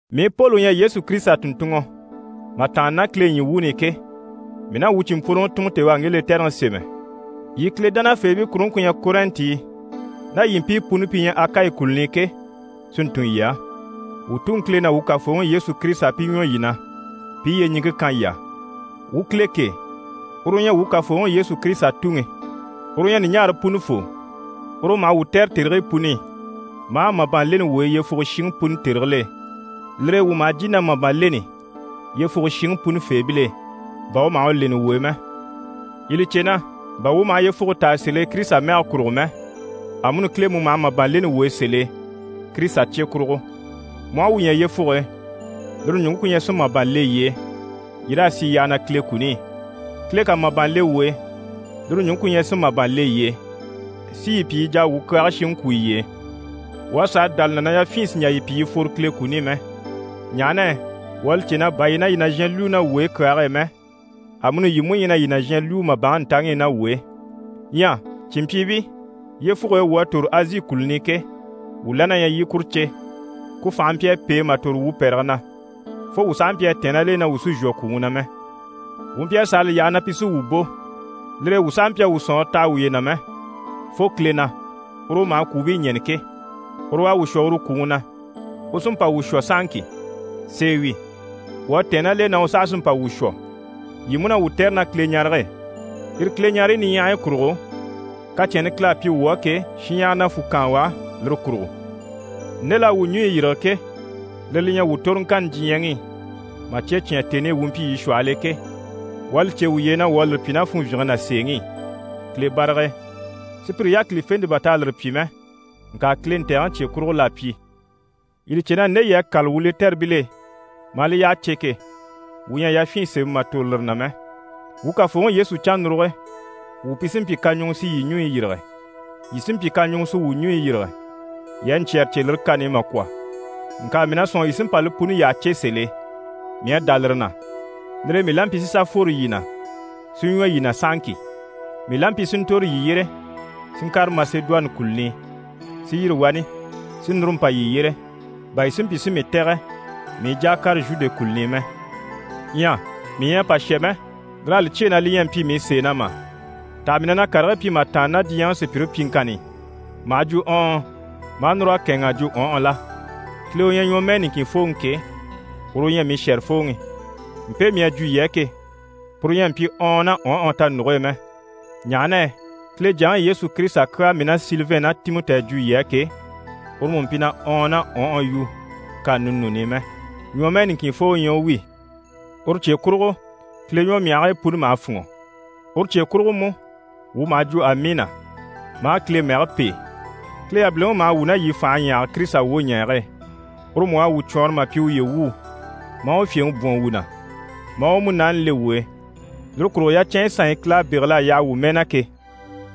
Mii Poli u ɲyɛ Yesu Kirisita tùnntunŋɔ mà tàanna ná Kile ɲyii wuuni i ke, mii ná wuu cìnmpworoŋi Timɔti u à ŋge lɛtɛrɛŋi sémɛ, yii Kile dánafeebii kuruŋke ku ɲyɛ Kɔrɛnti i ná yii mpii puni pi ɲyɛ Kile wuu Akayi kùluni i ke, si ntun yii á. Wuu Tuŋi Kile ná wuu Kafooŋi Yesu Kirisita pi ɲwɔ yii na, pi i yyeɲiŋke kan yii á. Wuu Kile kêe, uru u ɲyɛ wuu Kafooŋi Yesu Kirisita Tuŋi. Uru u ɲyɛ ɲùɲaare punifoo, uru u maha wuu tɛ̀re tèrigii puni i, maa màban leni wuu e yyefuge shiŋi puni tèrigil'e. Lire e wuu maha jìni na màban leni yyefuge shiŋi puni feebil'e, bà u maha u leni wuu e mɛ. Yii li cè na, bà wuu maha yyefuge taa sèl'e Kirisita mɛge kurugo mɛ, amuni Kile mú maha màban leni wuu e sèl'e Kirisita cye kurugo. Mu aha wuu ɲya yyefuge e, lire ɲùŋke ku ɲyɛ si màban le yii e, yii raa sì yyaha na Kile kuni i. Kile ká màban le wuu e, lire ɲùŋke ku ɲyɛ si màban le yii e, si yii pyi yii jà a wuu kyaage shiŋi kwú yiye e. Wuu à sàa dá li na na yafyin sì n‑jà yii pyi yii fworo Kile kuni i mɛ, ɲaha na yɛ wuu à li cè na, bà yii ɲyɛ na yii nàzhan lwúu ná wuu e kyaage e mɛ, amuni yii mú ɲyɛ na yii nàzhan lwúu màbanŋi ntaŋi i ná wuu e. Ɲyɛ cìnmpyiibii, yyefuge e wuu à tòro Azi kùluni i ke, wuu la na ɲyɛ yii i kuru cè. Ku fànhe mpyi a pêe mà tòro wuu pɛ̀rɛge na, fo wuu sàha mpyi a tɛ̀ɛn ná l'e na wuu sì n‑shwɔ kwùŋi na mɛ. Wuu mpyi a sàa li yaha na pi sí wuu bò, lire e wuu sàha mpyi a wuu sɔ̀nŋɔre taha wuye na mɛ, fo Kile na, uru u maha kwùubii ɲɛ̀ni ke. Uru u à wuu shwɔ uru kwùŋi na, u sí n‑pa wuu shwɔ sahaŋki. Sèe wi, wuu à tɛ̀ɛn ná l'e na u saha sí n‑pa wuu shwɔ. Yii mú na wuu tɛ̀re ná Kileɲarege e. Yire Kileɲareyi niɲyahayi kurugo, kacɛnni Kile à pyi wuu á ke, shinɲyahara na fwù kaan u á lire kurugo. Nde l'à wuu ɲùɲyi yîrige ke, lire li ɲyɛ wuu toroŋkanni diɲyɛŋi i, mà cye cyán tèni i wuu mpyi yii shwɔhɔl'e ke. Wuu à li cè wuye e na wuu à lire pyi ná funvyinge ná sèeŋi i, Kile barag'e. Sùpyire yákilifente bà t'à lire pyi mɛ, ŋka Kile ntɛ̀gɛŋi cye kurugo l'à pyi. Yii li cè na nde yii à kâla wuu lɛtɛribil'e maa li yyaha cè ke, wuu ɲyɛ a yafyin sémɛ mà tòro lire na mɛ. Wuu Kafooŋi Yesu cannuruge wuu pi sí n‑pyi kaɲuŋɔ si yii ɲùɲyi yîrige, yii sí n‑pyi kaɲuŋɔ si wuu wuyi yîrige. Yii à ɲcyɛ̀rɛ cè lire kani i mà kwɔ̀, ŋka mii na sɔ̂nŋi yii sí n‑pa li puni yyaha cè sèl'e. Mii à dá lire na, lire e, mii la mpyi si sà fworo yii na, si ɲwɔ yii na sahaŋki. Mii la mpyi si ntòro yii yyére, si ŋkàre Masedoni kùluni i, si yîri wani, si núru mpa yii yyére, bà yii si mpyi si mii tɛ̀gɛ mii i jà a kàre Zhude kùluni i mɛ. Ɲyɛ mii ɲyɛ a pa shà mɛ, lir'à li cyêe na li ɲyɛ a mpyi mii sèe na mà? Taha mii na na karigii pyi mà tàanna ná diɲyɛŋi sùpyire pyiŋkanni i, maha jwo: «ɔɔn» maa núr'a kɛ̂ɛnŋ'a jwo: «ɔnhɔ» la? Kile u ɲyɛ ɲwɔmɛɛ niŋkin fooŋi ke, uru u ɲyɛ mii shɛ̀rɛfooŋi, mpe mii à jwo yii á ke, puru ɲyɛ a mpyi: «ɔɔn» ná «ɔnhɔ» tanuge e mɛ. Ɲaha na yɛ Kile Jyaŋi Yesu Kirisita kyaa mii ná Silivɛn ná Timɔti à jwo yii á ke, uru mú mpyi na «ɔɔn» ná «ɔnhɔ» yu kani ninuuni i mɛ, ɲwɔmɛɛ niŋkinfoo u ɲyɛ u wi. Uru cye kurugo, Kile ɲwɔmyahigii puni maha fûnŋɔ, uru cye kurugo mú, wuu maha jwo: «Amiina» maa Kile mɛge pêe. Kile yabiliŋi u maha wuu ná yii fànhe ɲyahage Kirisita wwoɲɛɛge e, uru mú u à wuu cwɔɔnrɔ mà pyi uye wuu, maa u fyèŋi bwɔ̀n wuu na, maa u Munaani le wuu e. Lire kurugo yacɛnyi sanɲyi Kile à bégel'a yaha wuu mɛɛ na ke,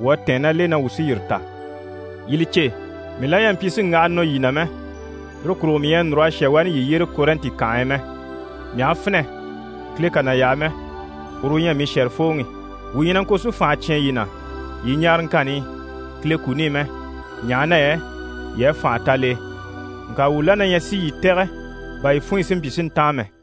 wuu à tɛ̀ɛn ná l'e na wuu sí yire ta. Yii li cè, mii la ɲyɛ a mpyi si ŋgaha nɔ yii na mɛ, lire kurugo mii ɲyɛ a núr'a shà wani yii yyére Kɔrɛnti kànhe e mɛ. Mii aha finɛ, Kile kà na yaha mɛ, uru u ɲyɛ mii shɛ̀rɛfooŋi. Wuu ɲyɛ na ŋko si fànha cyán yii na yii ɲaaraŋkanni i Kile kuni i mɛ, ɲaha na yɛ yii à fànha ta l'e. Ŋka wuu la na ɲyɛ si yii tɛ̀gɛ bà yii funɲyi si mpyi si ntáan mɛ.